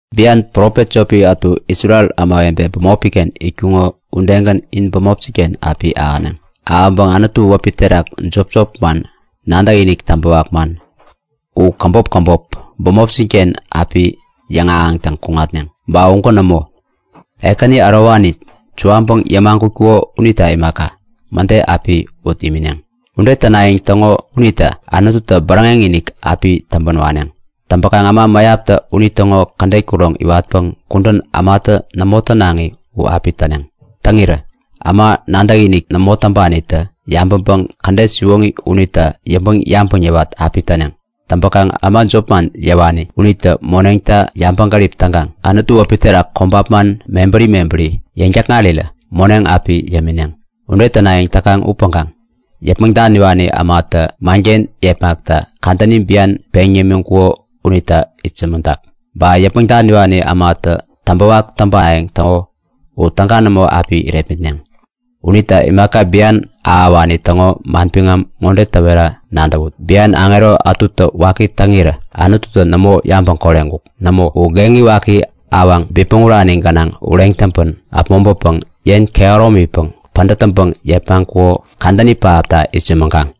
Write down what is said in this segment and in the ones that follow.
Bian profet jopi ätu Isrel ämawebe bämopi-ken itkuŋo udegän in bämopjin-ken api ahäneŋ. Ahäŋkaŋ Anutu wäpi terak jop manman, nadäkinik täŋpäwak man, u käbop käbop bämopjin-ken api yäŋahäŋtäŋ kuneŋ. Ba ugän nämo, Ekäni ärowani suwaŋpäŋ yämagutkuko unita imaka, mäde api ut imineŋ. Ude tänayäŋ täŋo unita Anututä bäräŋek-inik api täŋpän waneŋ. Täŋpäkaŋ äma mäyaptä unitäŋo kädet kuroŋ iwatpäŋ kudän ämatä nämo tänaŋi u api täneŋ. Täŋirä äma nadäkinik nämo täŋpanitä yabäŋpäŋ man bureni täŋo kädet unita yäŋpäŋ-yabäŋ yäwat api täneŋ. Täŋpäkaŋ äma jopman yäwani unitä moneŋta yabäŋgärip täŋkaŋ Anutu wäpi terak kobap man mebäri mebäri yäŋ-täkŋarirä moneŋ api yämineŋ. Ude tänayäŋ täkaŋ upäŋkaŋ yäpmäŋ daniwani ämatä manken yepmakta kadäni bian peŋ yämiŋkuko unita itsämäŋtak. Ba yäpmäŋ daniwani ämatä täŋpäwak täŋpayäŋ täko u täga nämo api irepmitneŋ. Unita imaka bian ahäwani täŋo manbiŋam ŋode täwera nadäwut; Bian aŋero ätutä waki täŋirä Anututä nämo yabäŋ koreŋkuk. Nämo, u geŋi waki, awaŋ bipmäŋ urani gänaŋ uken ureŋ täŋpän äpmoŋpäpäŋ yen kehäromipäŋ pädät täŋpäŋ yepmaŋkuko kadäni pähapta itsämäŋkaŋ.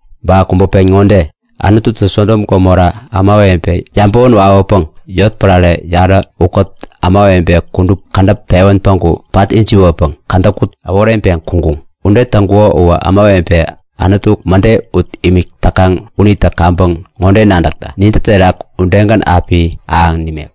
Ba kubä pen ŋode; Anututä Sodom Gomora ämawebe yabäwän wawäpäŋ yotpärare yarä ukät ämawebe kudup kädäp pewän päŋku pat ijiwäpäŋ kädäkut äworeŋpeŋ kuŋkuŋ. Ude täŋkuko uwä ämawebe Anutu mäde ut imik täkaŋ unitä kaŋpäŋ ŋode nadäkta; Nintä terak udegän api ahäŋ nimek.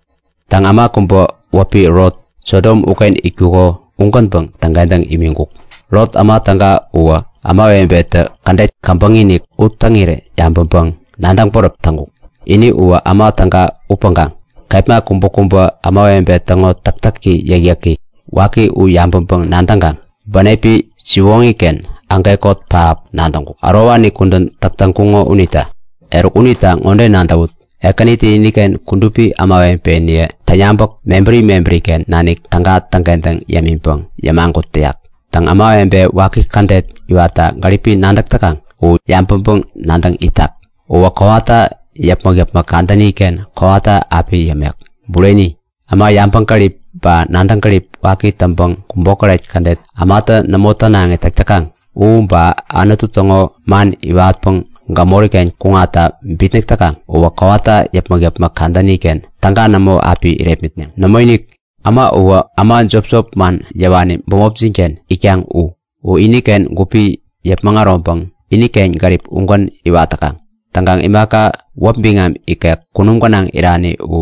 Täŋ, äma kubä wäpi Lot, Sodom uken itkuko ugänpäŋ täŋkentäŋ imiŋkuk. Lot, äma täga uwä ämawebetä kädet käbäŋi-inik u täŋirä yabäŋkaŋ nadäŋ bäräp täŋkuk. Ini uwä äma täga upäŋkaŋ kepma kubäkubä ämawebe täŋo täktäki yäkyäki waki u yabäŋpäŋ-nadäŋkaŋ bänepi siwoŋi-ken ägekot pähap nadäŋkuk, ärowani kudän täk täŋkuŋo unita. Eruk unita ŋode nadäwut; Ekänitä iniken kudupi ämawebeniye täŋyabäk mebäri mebäri-ken nanik täga täŋkentäŋ yämiŋpäŋ yämagut täyak. Täŋ, ämawebe waki kädet iwatta gäripi nadäk täkaŋ u yabäŋ yäwat itak. Yabäŋ yäwat ittäŋgän kowata yäpmäk-yäpmäk kadäni-ken kowata api yämek. Bureni, äma kaŋgärip ba nadäŋ gärip waki täŋpäŋ kubokäret kädet ämatä nämo tänaŋi täk täkaŋ u, ba Anutu täŋo man iwatpäŋ gämori-ken kuŋatta bitnäk täkaŋ uwä kowata yäpmäk-yäpmäk kadäni-ken täga nämo api irepmitneŋ. Nämoinik! Äma uwä äma jop manman yäwani bämopjin-ken itkaŋ u. U iniken gupi yäpmäŋ äroŋpäŋ iniken gärip ugän iwat täkaŋ. Täŋkaŋ imaka wäpi biŋam ikek kunum gänaŋ irani u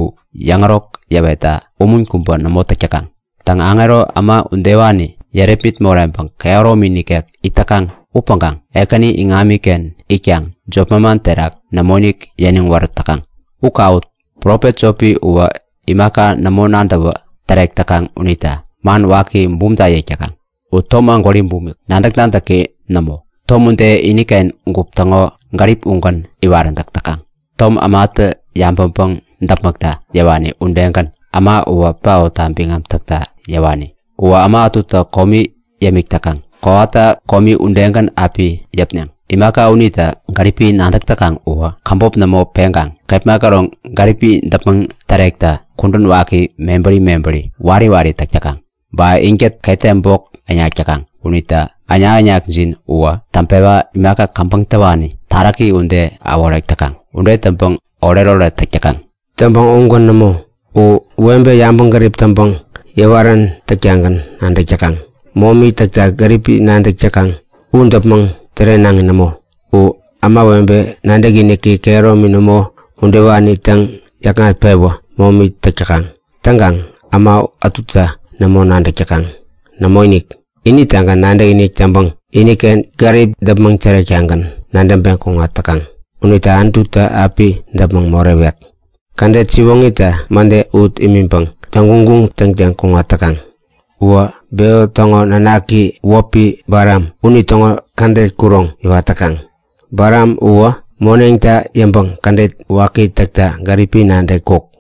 yäŋärok yäwetta umun kubä nämo täk täkaŋ. Nadäkaŋ, aŋero, äma udewani yärepmit moreŋpäŋ kehäromi nikek it täkaŋ upäŋkaŋ Ekäni iŋamiken itkaŋ jop manman terak nämoinik yäniŋ wärät täkaŋ. U kawut! Profet jopi uwä imaka nämo nadäwä tärek täkaŋ unita man waki bumta yäk täkaŋ. U tom ägwäri bumik, nadäk-nadäki nämo. Tom ude, iniken gup täŋo gärip ugän iwaräntäk täkaŋ. Tom ämatä yabäŋpäŋ däpmäkta yäwani udegän äma uwä paotta biŋam täkta yäwani. Uwä äma ätuta komi yämik täkaŋ kowata komi udegän api yäpneŋ. Imaka unita gäripi nadäk täkaŋ uwä käbop nämo peŋkaŋ kepma käroŋ gäripini däpmäŋ tärekta kudän waki mebäri mebäri wari wari täk täkaŋ. Ba inkät ketem bok täŋnak täkaŋ unitä äŋnak-äŋnakjin uwä täŋpewä imaka käbäŋ täwani taräki ude äworek täkaŋ. Ude täŋpäŋ oretoret täk täkaŋ. Täŋpäŋ ugän nämo. U webe yabäŋgärip taŋpäŋ yäwarän täktagän nadäk täkaŋ. Momi täkta gäripi nadäk täkaŋ, u däpmäŋ tärenaŋi nämo. Ude täŋkaŋ ämawebe nadäkiniki kehäromi nämo udewani täŋyäkŋat-pewä momi täk täkaŋ. Täŋkaŋ äma ätuta nämo nadäk täkaŋ. Nämoinik, initagän nadäkinik täŋpäŋ iniken gärip däpmäŋ tärektagän nadäŋpeŋ kuŋat täkaŋ. Unita Anututä api däpmäŋ morewek. Kädet siwoŋita mäde ut imiŋpäŋ täŋguŋguŋ täŋtäŋ kuŋat täkaŋ. Uwä Beo täŋo nanaki wäpi Balam unitäŋo kädet kuroŋ iwat täkaŋ. Balam uwä moneŋta yäŋpäŋ kädet waki täkta gäripi nadäŋkuk.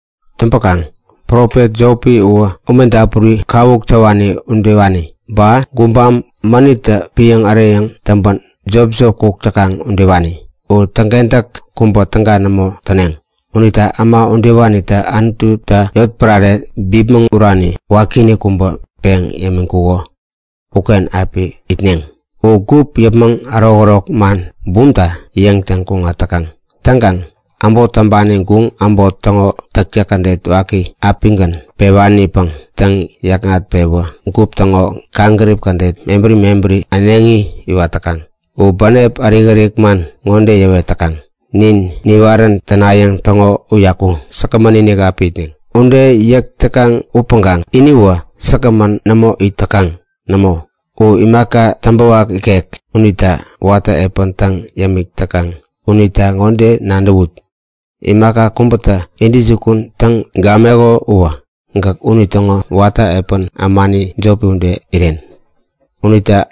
Täŋpäkaŋ profet jopi uwä ume dapuri kawuk täwani udewani. Ba gubam mänittä piäŋ äreyäŋ täŋpän jopjop kuk täkaŋ udewani. U täŋkentäk kubä täga nämo täneŋ. Unita äma udewanita Anututä yotpärare bipmäŋ urani wakiinik kubä peŋ yämiŋkuko uken api itneŋ. U gup yäpmäŋ ärokärok man bumta yäŋtäŋ kuŋat täkaŋ. Täŋkaŋ äbot täŋpani guŋ äbot täŋo täktäk kädet waki apigän pewanipäŋ täŋyäkŋat-pewä gup täŋo kaŋgärip kädet mebäri mebäri äneŋi iwat täkaŋ. U bänep ärik-ärik man ŋode yäwet täkaŋ; Nin niwarän tänayäŋ täŋo uyaku säkgämän-inik api itneŋ. Ude yäk täkaŋ upäŋkaŋ iniwä säkgämän nämo it täkaŋ. Nämo, u imaka täŋpäwak ikek unita watä epän täŋ imik täkaŋ. Unita ŋode nadäwut; Imaka kubätä intäjukun täŋ gameko uwä, gäk unitäŋo watä epän ämani jopi ude iren. Unita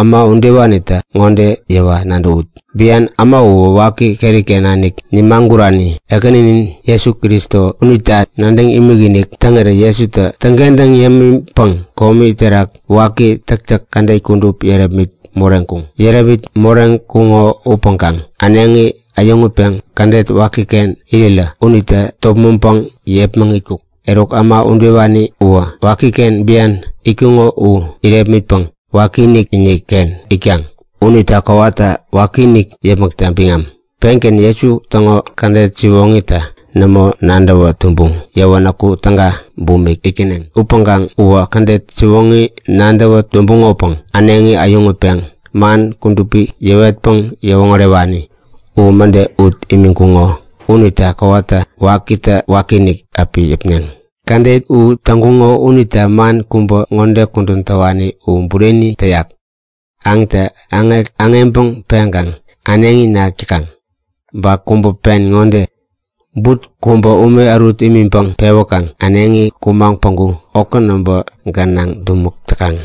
äma udewanita ŋode yäwa nadäwut; Bian äma uwä waki keri-ken nanik nimagurani Ekäninin Jesu Kristo unita nadäŋ imikinik täŋirä Jesutä täŋkentäŋ yämiŋpäŋ kome terak waki täktäk kädet kudup yärepmit moreŋkuŋ. Yärepmit moreŋkuŋo upäŋkaŋ äneŋi äyäŋutpeŋ kädet wakiken irirä unitä topmäŋpäŋ yepmäŋitkuk. Eruk äma udewani uwä wakiken bian itkuŋo u irepmitpäŋ wakiinik-inik-ken itkaŋ. Unita kowata wakiinik yäpmäkta biŋam. Pengän Jesu täŋo kädet siwoŋita nämo nadäwä tumbuŋ yäwänäku täga bumik itkäneŋ. Upäŋkaŋ uwä kädet siwoŋita nadäwä tumbuŋopäŋ äneŋi äyäŋutpeŋ man kudupi yäwetpäŋ yäwoŋärewani u mäde ut imiŋkuŋo unita kowata wakitä wakiinik api yäpneŋ. Kädet u täŋkuŋo unita man kubä ŋode kudän täwani u bureni täyak; Aŋtä aŋek aŋeŋpäŋ peŋkaŋ äneŋi nak täkaŋ. Ba kubä pen ŋode; But kubä ume ärut imiŋpäŋ pewäkaŋ äneŋi kumaŋ päŋku okä näbä gänaŋ dumäk täkaŋ.